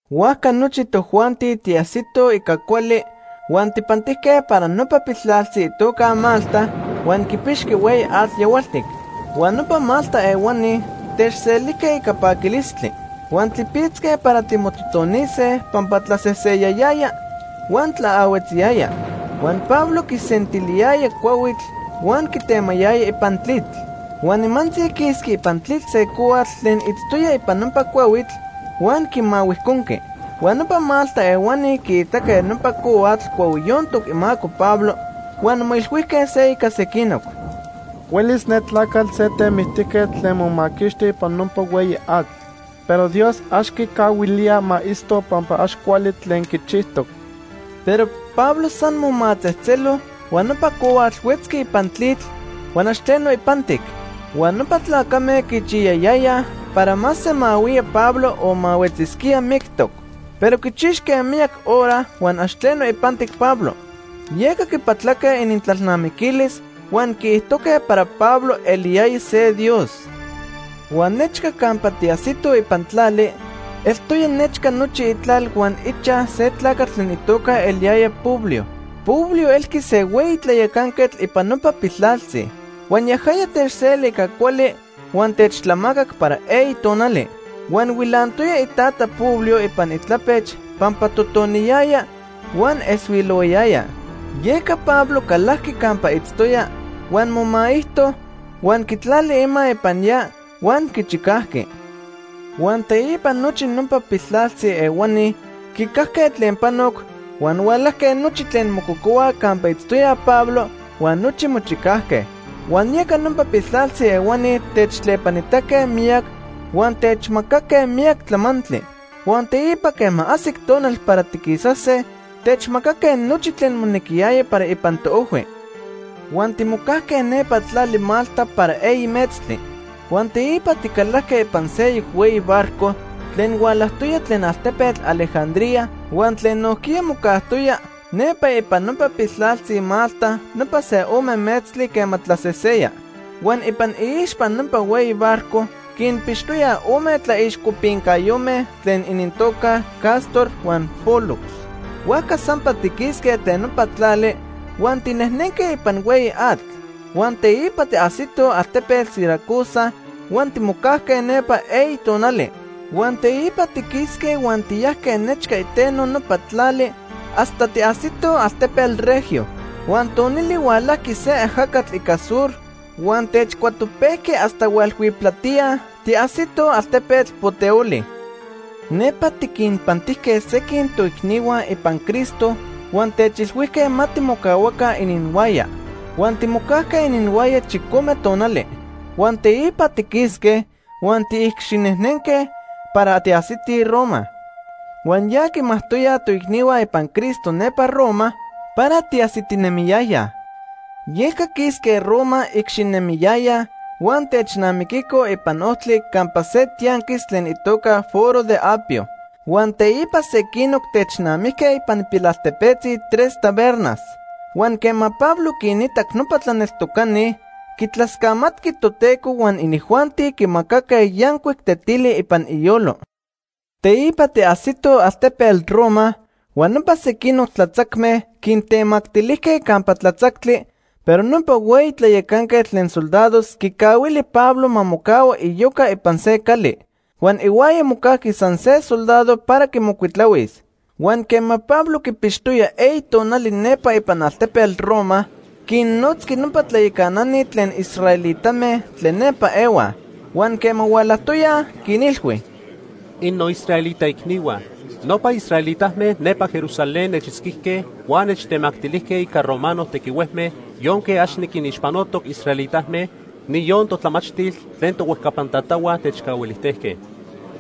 Huajca nochi tojuanti tiajsitoj ica cuali, huan tijpantijque para nopa piltlaltzi itoca Malta huan quipixqui hueyi atl yahualtic. Huan nopa Malta ehuani techselijque ica paquilistli. Huan tlipitzque para timototonise pampa tlaseseyayaya huan tlaahuetziyaya. Huan Pablo quisentiliyaya cuahuitl huan quitemayaya ipan tlitl. Huan nimantzi quisqui ipan tlitl se cohuatl tlen itztoya ipan nopa cuahuitl, huan quimahuijconqui. Huan nopa Malta ehuani quiitaque nopa cohuatl cuahuiyontoc imaco Pablo huan moilhuijque se ica sequinoc: “Huelis ne tlacatl se temictijquetl tlen momaquixti ipan nopa hueyi atl, pero Dios ax quicahuilía ma itzto pampa ax cuali tlen quichijtoc.” Pero Pablo san momatzejtzelo huan nopa cohuatl huetzqui ipan tlitl, huan ax tleno ipantic. Huan nopa tlacame quichiyayayaj para ma semahuía Pablo o ma huetzisquía mictoc. Pero quichixque miyac hora, huan ax tleno ipantic Pablo. Yeca quipatlaque inintlalnamiquilis huan quiijtojque para Pablo eliyaya se dios. Huan nechca campa tiajsitoj ipan tlali, eltoya nechca nochi itlal huan ichaj se tlacatl tlen itoca eliyaya Publio. Publio elqui se hueyi tlayacanquetl ipan nopa piltlaltzi. Huan yajaya techseli ica cuali huan techtlamacac para eyi tonali. Huan huilantoya itata Publio ipan itlapech pampa totoniyayaya huan eshuilohuayaya. Yeca Pablo calajqui campa itztoya, huan momaijto, huan quitlali ima ipan ya huan quichicajqui. Huan teipa nochi nopa piltlaltzi ehuani quicajque tlen panoc, huan hualajque nochi tlen mococohuaj campa itztoya Pablo huan nochi mochicajque. Huan yeca nopa piltlaltzi ehuani techtlepanitaque miyac huan techmacaque miyac tlamantli. Huan teipa quema ajsic tonal para tiquisase, techmacaque nochi tlen monequiyaya para ipan toojhui. Huan timocajque nepa tlali Malta para eyi metztli. Huan teipa ticalajque ipan seyoc hueyi barco tlen hualajtoya tlen altepetl Alejandría huan tlen nojquiya mocajtoya nepa ipan nopa piltlaltzi Malta nopa se ome metztli quema tlaseseya. Huan ipan iixpa nopa hueyi barco quinpixtoya ome tlaixcopincayome tlen inintoca Cástor huan Pólux. Huajca sampa tiquisque tlen nopa tlali huan tinejnenque ipan hueyi atl. Huan teipa tiajsitoj altepetl Siracusa huan timocajque nepa eyi tonali. Huan teipa tiquisque huan tiyajque nechca iteno nopa tlali hasta tiajsitoj altepetl Regio. Huan tonili hualajqui se ajacatl ica sur huan techcuatopejqui hasta hualhuiptlatía tiajsitoj altepetl Puteoli. Nepa tiquinpantijque sequin toicnihua ipan Cristo huan techilhuijque ma timocahuaca ininhuaya. Huan timocajque ininhuaya chicome tonali. Huan teipa tiquisque huan tiicxinejnenque para tiajsitij Roma. Huan ya quimajtoyaj toicnihua ipan Cristo nepa Roma para tiajsitinemiyayaj. Yeca quisque Roma icxinemiyayaj huan technamiquicoj ipan ojtli campa se tianquis tlen itoca Foro de Apio. Huan teipa sequinoc technamijque ipan pilaltepetzi Tres Tabernas. Huan quema Pablo quinitac nopa tlaneltocani, quitlascamatqui Toteco huan inijuanti quimacaque yancuic tetili ipan iyolo. Teipa tiajsitoj altepetl Roma huan nopa sequinoc tlatzacme quintemactilijque campa tlatzactli, pero nopa hueyi tlayacanquetl tlen soldados quicahuili Pablo ma mocahua iyoca ipan se cali. Huan ihuaya mocajqui san se soldado para quimocuitlahuis. Huan quema Pablo quipixtoya eyi tonali nepa ipan altepetl Roma, quinnotzqui nopa tlayacanani tlen israelitame tlen nepa ehuaj. Huan quema hualajtoyaj, quinilhui: ―Innoisraelita icnihua, nopa israelitame nepa Jerusalén nechitzquijque huan nechtemactilijque ica romano tequihuejme yonque ax niquinixpanotoc israelitame, niyon totlamachtil tlen tohuejcapan tatahua techcahuilijtejque.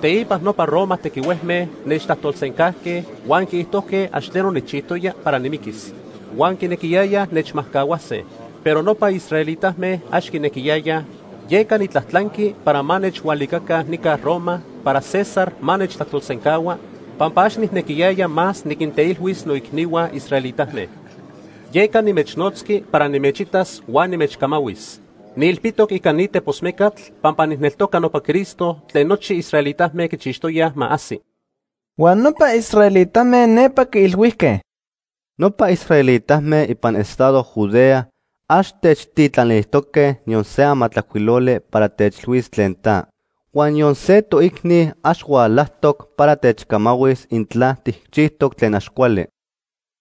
Teipa nopa Roma tequihuejme nechtlajtolsencajque huan quiijtojque ax tleno nijchijtoya para nimiquis. Huan quinequiyayaj nechmajcahuase. Pero nopa israelitame ax quinequiyayaj, yeca nitlajtlanqui para ma nechhualicaca nica Roma para César ma nechtlajtolsencahua, pampa ax nijnequiyaya más niquinteilhuis noicnihua israelitame. Yeca nimechnotzqui para nimechitas huan nimechcamahuis. Niilpitoc ica ni tepos mecatl pampa nijneltoca nopa Cristo tlen nochi israelitame quichixtoyaj ma ajsi. Huan nopa israelitame nepa quiilhuijque: ―Nopa israelitame ipan estado Judea ax techtitlanilijtoque niyon se amatlajcuiloli para techilhuis tlen ta. Huan niyon se toicni ax hualajtoc para techcamahuis intla tijchijtoc tlen ax cuali.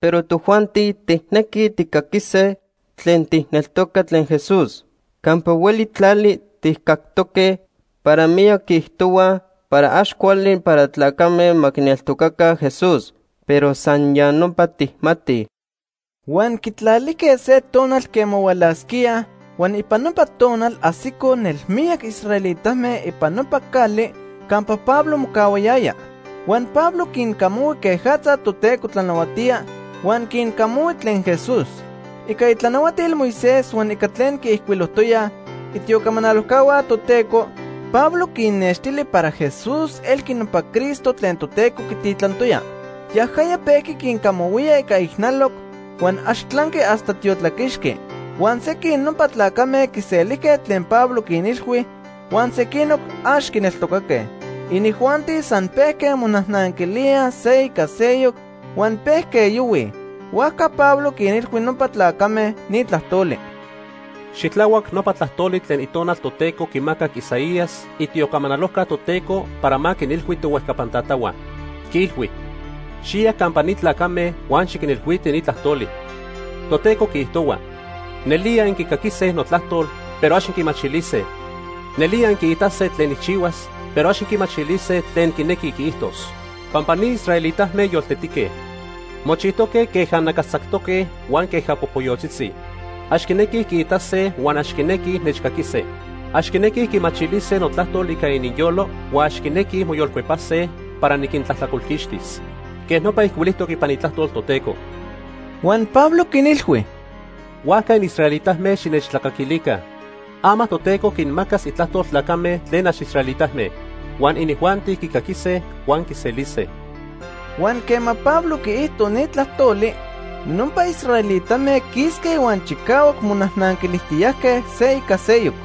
Pero tojuanti tijnequij tijcaquise tlen tijneltoca tlen Jesús. Campa hueli tlali tijcactoque para miyac quiijtohuaj para ax cuali para tlacame ma quineltocaca Jesús. Pero san ya nopa tijmatij. Huan quitlalijque se tonal quema hualasquíaj, huan ipan nopa tonal ajsicoj nelmiyac israelitame ipan nopa cali campa Pablo mocahuayaya. Huan Pablo quincamahui quejatza Toteco tlanahuatía huan quincamahui tlen Jesús. Ica itlanahuatil Moisés huan ica tlen quiijcuilojtoyaj itiocamanalojcahua Toteco, Pablo quinnextili para Jesús elqui nopa Cristo tlen Toteco quititlantoya. Yajaya pejqui quincamahuía ica ijnaloc huan ax tlanqui hasta tiotlaquixqui. Huan sequin nopa tlacame quiselijque tlen Pablo quinilhui, huan sequinoc ax quineltocaque. Inijuanti san pejque monajnanquilíaj se ica seyoc huan pejque yohuij. Huajca Pablo quinilhui nopa tlacame ni tlajtoli: ―Xitlahuac nopa tlajtoli tlen Itonal Toteco quimacac Isaías, itiocamanalojca Toteco para ma quinilhui tohuejcapan tatahua. Quiilhui: ‘Xiya campa ni tlacame huan xiquinilhuiti ni tlajtoli. Toteco quiijtohua: Nelía inquicaquise notlajtol, pero ax inquimachilise. Nelía inquiitase tlen nijchihuas, Pero ax inquimachilise tlen quinequi quiijtos. Pampa ni israelitame yoltetique. Mochijtoque queja nacastzactoque huan queja popoyotzitzi. Ax quinequij quiitase huan ax quinequij nechcaquise. Ax quinequij quimachilise notlajtol ica ininyolo, Huan ax quinequij moyolcuepase para niquintlajtlacolquixtis. Quej nopa ijcuilijtoc ipan Itlajtol Toteco.’ Huan Pablo quinilhui: ―Huajca inisraelitame, xinechtlacaquilica. Ama Toteco quinmacas itlajtol tlacame tlen ax israelitame. Huan inijuanti quicaquise huan quiselise. Huan quema Pablo quiijto ni tlajtoli, nopa israelitame quisque huan chicahuac monajnanquilijtiyajque se ica seyoc.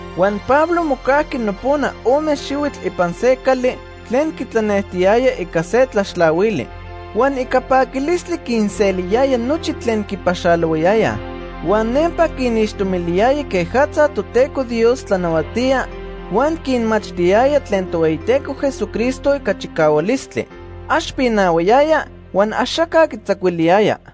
Huan Pablo mocajqui nopona ome xihuitl ipan se cali tlen quitlanejtiyaya ica se tlaxtlahuili. Huan ica paquilistli quinseliyaya nochi tlen quipaxalohuayayaj. Huan nempa quinixtomiliyaya quejatza Toteco Dios tlanahuatía, huan quinmachtiyaya tlen Tohueyiteco Jesucristo ica chicahualistli. Ax pinahuayaya, huan axaca quitzacuiliyaya.